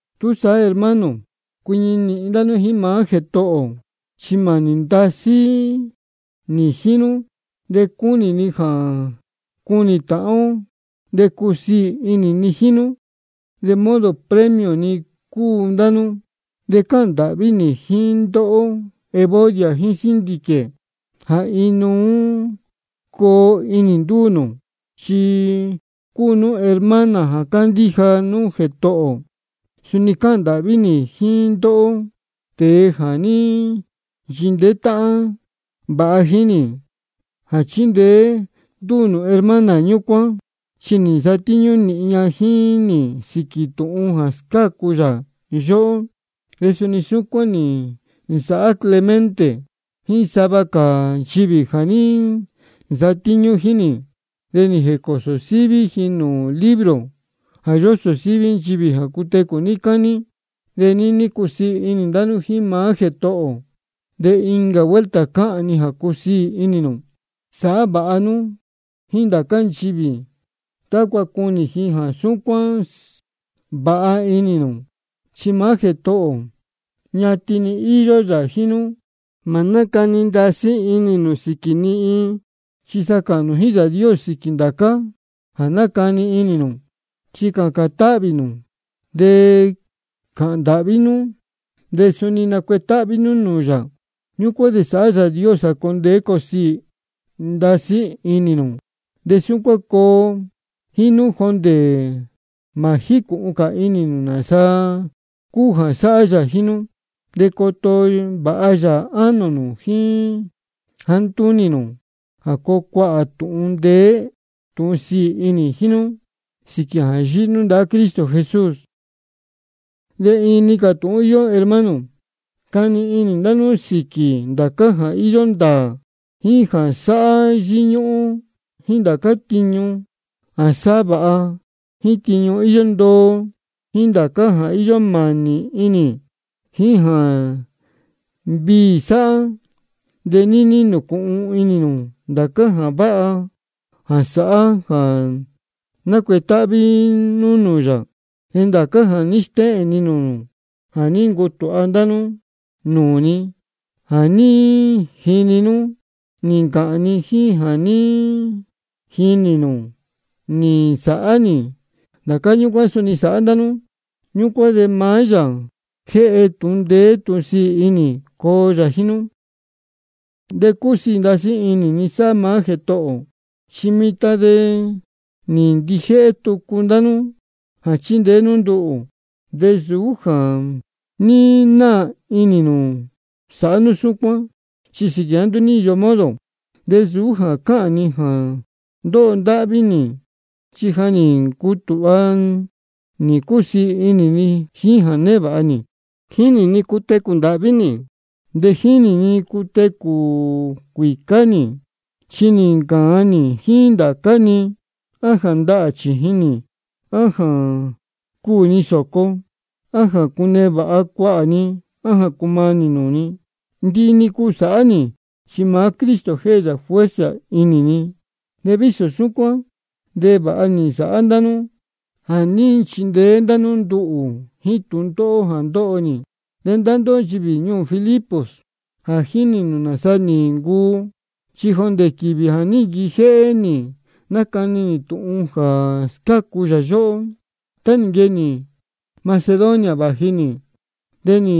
Túsaá hermano, cuiñi nīhin ndá nú jíín maá Jētohō ō. Chi mānī ndasí nī jíín nú, de cúnī ni jā cunī tāhán ó, de cúsiī inī ni jíín nú, de modo premio ni cúu ndá nú. De cáhān ndāhví nī jíín ndóhó Evodia jíín Síntique jā inuú coo inī ndúū nū, chi cúu nú hermana jā cándíja nú maá Jētohō ō. De suni cáhān ndāhví nī jíín ndóhó, tēe jā ní nchindeé táhán vāha jíín nī, jā chindeé nú ndúū hermana ñúcuán, chi nī nsatíñú nīhin ña jíín nī sīquī tūhun jā scácu yā yóhó. De suni súcuán nī nsāhá Clemente jíín sava cā nchivī jā ní nsatíñú jíín nī. De nī jēcōsō síví ji nūū libro jā yósō síví nchivī jā cutecū níí cání. De níní cusiī inī ndá nú jíín maá Jētohō ō. De incā vuelta cáhān ni jā cusiī inī nū. Sāhá vāha nú jíín ndācá nchivī, tácua cunī ji jā súcuán vāha inī nū. Chi maá Jētohō ō, ñatin-ni íyó yā jíín nú. Mā nácani ndasí inī nū sīquī ni iin. Chi sa cāhān nū jíín Yāā Dios sīquī ndācá jā nácani inī nū. Chi cācān táhvī nū, de cāhān ndāhví nú, de suni nacuetáhví nú nūū yā. Ñúcuán de sāhá Yāā Dios jā coo ndeé coo siī ndasí inī nū, de súcuán coo jíín nú jondē mā jícūhun cā inī nū nāsa cúu jā sáhá yā jíín nú. De coto vāha yā ánō nū jíín jāá ntúnī nū, jā coo cuāhā tūhun ndeé tūhun sīī inī jíín nú sīquī jā yíhí nú ndahá Cristo Jesús. De iin-ni cā tūhun íyó, hermano. Cani inī ndá nú sīquī ndācá jā íyó ndāā, jíín jā sáhá yíñúhún, jíín ndācá tiñu jā sáhá vāha, jíín tiñu íyó ndoo, jíín ndācá jā íyó mānī inī, jíín jā viī sáhá. De níní nūcūhun inī nū ndācá jā váha jā sáhá jā nácuetáhví nú nūū yā. Ndācá jā ní stéhēn ni nūū nū, jā ní ncutūha ndá nú nūū ni, jā ní jini nú nī ncāhān ni, jíín jā ní jinī nū nī nsāhá nī, ndācá ñúcuán suni sāhá ndá nú. Ñúcuán de maá Yāā jā jéhe tūhun ndeé tūhun sīī inī, coo yā jíín nú. De cúsiī ndasí inī ni sáhá maá Jētohō ō, chi mitan de nī ndijéhé tucu ndá nú jā chindeé nú nduhū. De nsūú jā ní naā inī nū sāhá nú súcuán, chi sīquī jāá nduú ní íyo modo. De nsūú jā cáhān ni jā ndóho ndáhví nī, chi ja nī ncutūha nī cúsiī inī ni jíín jā névāha nī. Jínī ni cutecū ndāhví nī, de jínī ni cutecū cuīcá nī. Chi nī ncāan nī jíín ndācá-ni, á jā ndahā chījin nī á jā cuū ni sōco, á jā cunevāha cuāhā ni á jā cumanī nūū ni. Ndihi-ni cúu sáhá nī, chi maá Cristo jéhe yā fuerza inī ni. De vísō súcuán de vāha nī nsāhá ndá nú jā ní nchindeé nú nduhū jíín tūndóhó jā ndóho nī. De ndá ndóhó nchivī ñuū Filipos, ja jínī nū nāsa nī ncuu. Chi jondē quīvī jā ní nquijéhé nī nácani nī tūhun jā scácu yā yóhó, tá nī nquee nī Macedonia vāji nī, de nī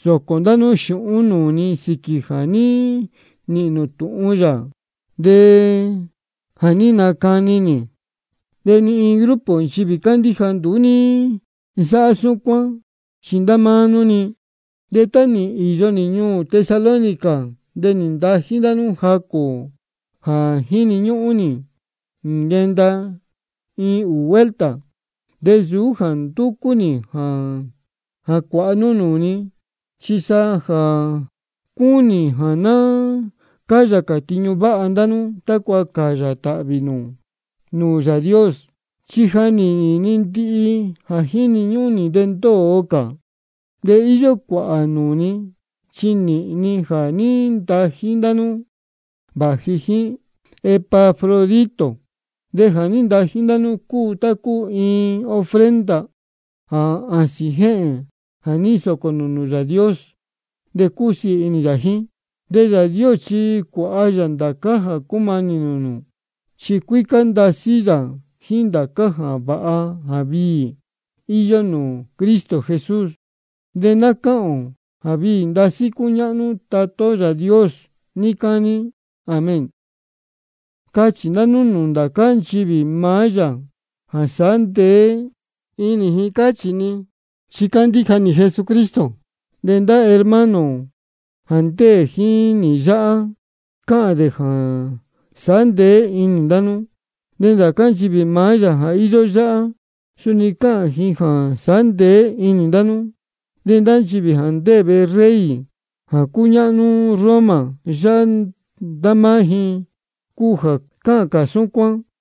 nsōcō ndá nú xūhún nūū ni sīquī jā ní nīhīn nū tūhun yā jā ní nacani nī. De ni iin grupo nchivī cándíja nduú ní nsáhá súcuán, chi ndá máá nú-ni. De tá nī īyo nī ñuū Tesalónica de nī ntají ndá nú jacū jā jíni ñúhún nī, nī nquenda iin ūū vuelta. De nsūú jā ndúcú nī jā cuāha nú nūū ni, chi sa cúnī ni jā ná cáyā cā tiñu váha ndá nú, tácua cāyā tāhvī nū nūū Yāā Dios. Chi ja nī nīhīn ni ndihi jā jíni ñúhún nī, de ndóo cā. De íyó cuāhā nūū ni, chi nī nīhīn ni jā ní ntají ndá nú vāji jíín Epafrodito. De jā ní ntají ndá nú cúu tá cúu iin ofrenda jā āsīn jéhēn jā ní nsōcō nū nūū Yāā Dios, de cúsiī inī yā jíín. De Yāā Dios chi cuāha yā ndācá jā cúmanī nūū nū, chi cuícá ndasí yā jíín ndācá jā váha jā viī íyó nūū Cristo Jesús. De ná cáhān ō jā viī ndasí cúñáhnú Tatá ó Yāā Dios níí cání. Amén. Cachī ndá nú nūū ndācá nchivī maá yā jā sāhá ndeé inī ji, cáchī ni, chi cándíja ji Jesucristo. De ndá hermano ō jā ndéē jíín nī yáhá, cáhān dē jā sāhá ndeé inī ndá nú. De ndācá nchivī maá yā jā íyó yáhá, suni cáhān ji jā sāhá ndeé inī ndá nú. De nchivī jā ndéē vehe rey jā cúñáhnú Roma yáhá, ndá máá ji cúu jā cáhān cā súcuán.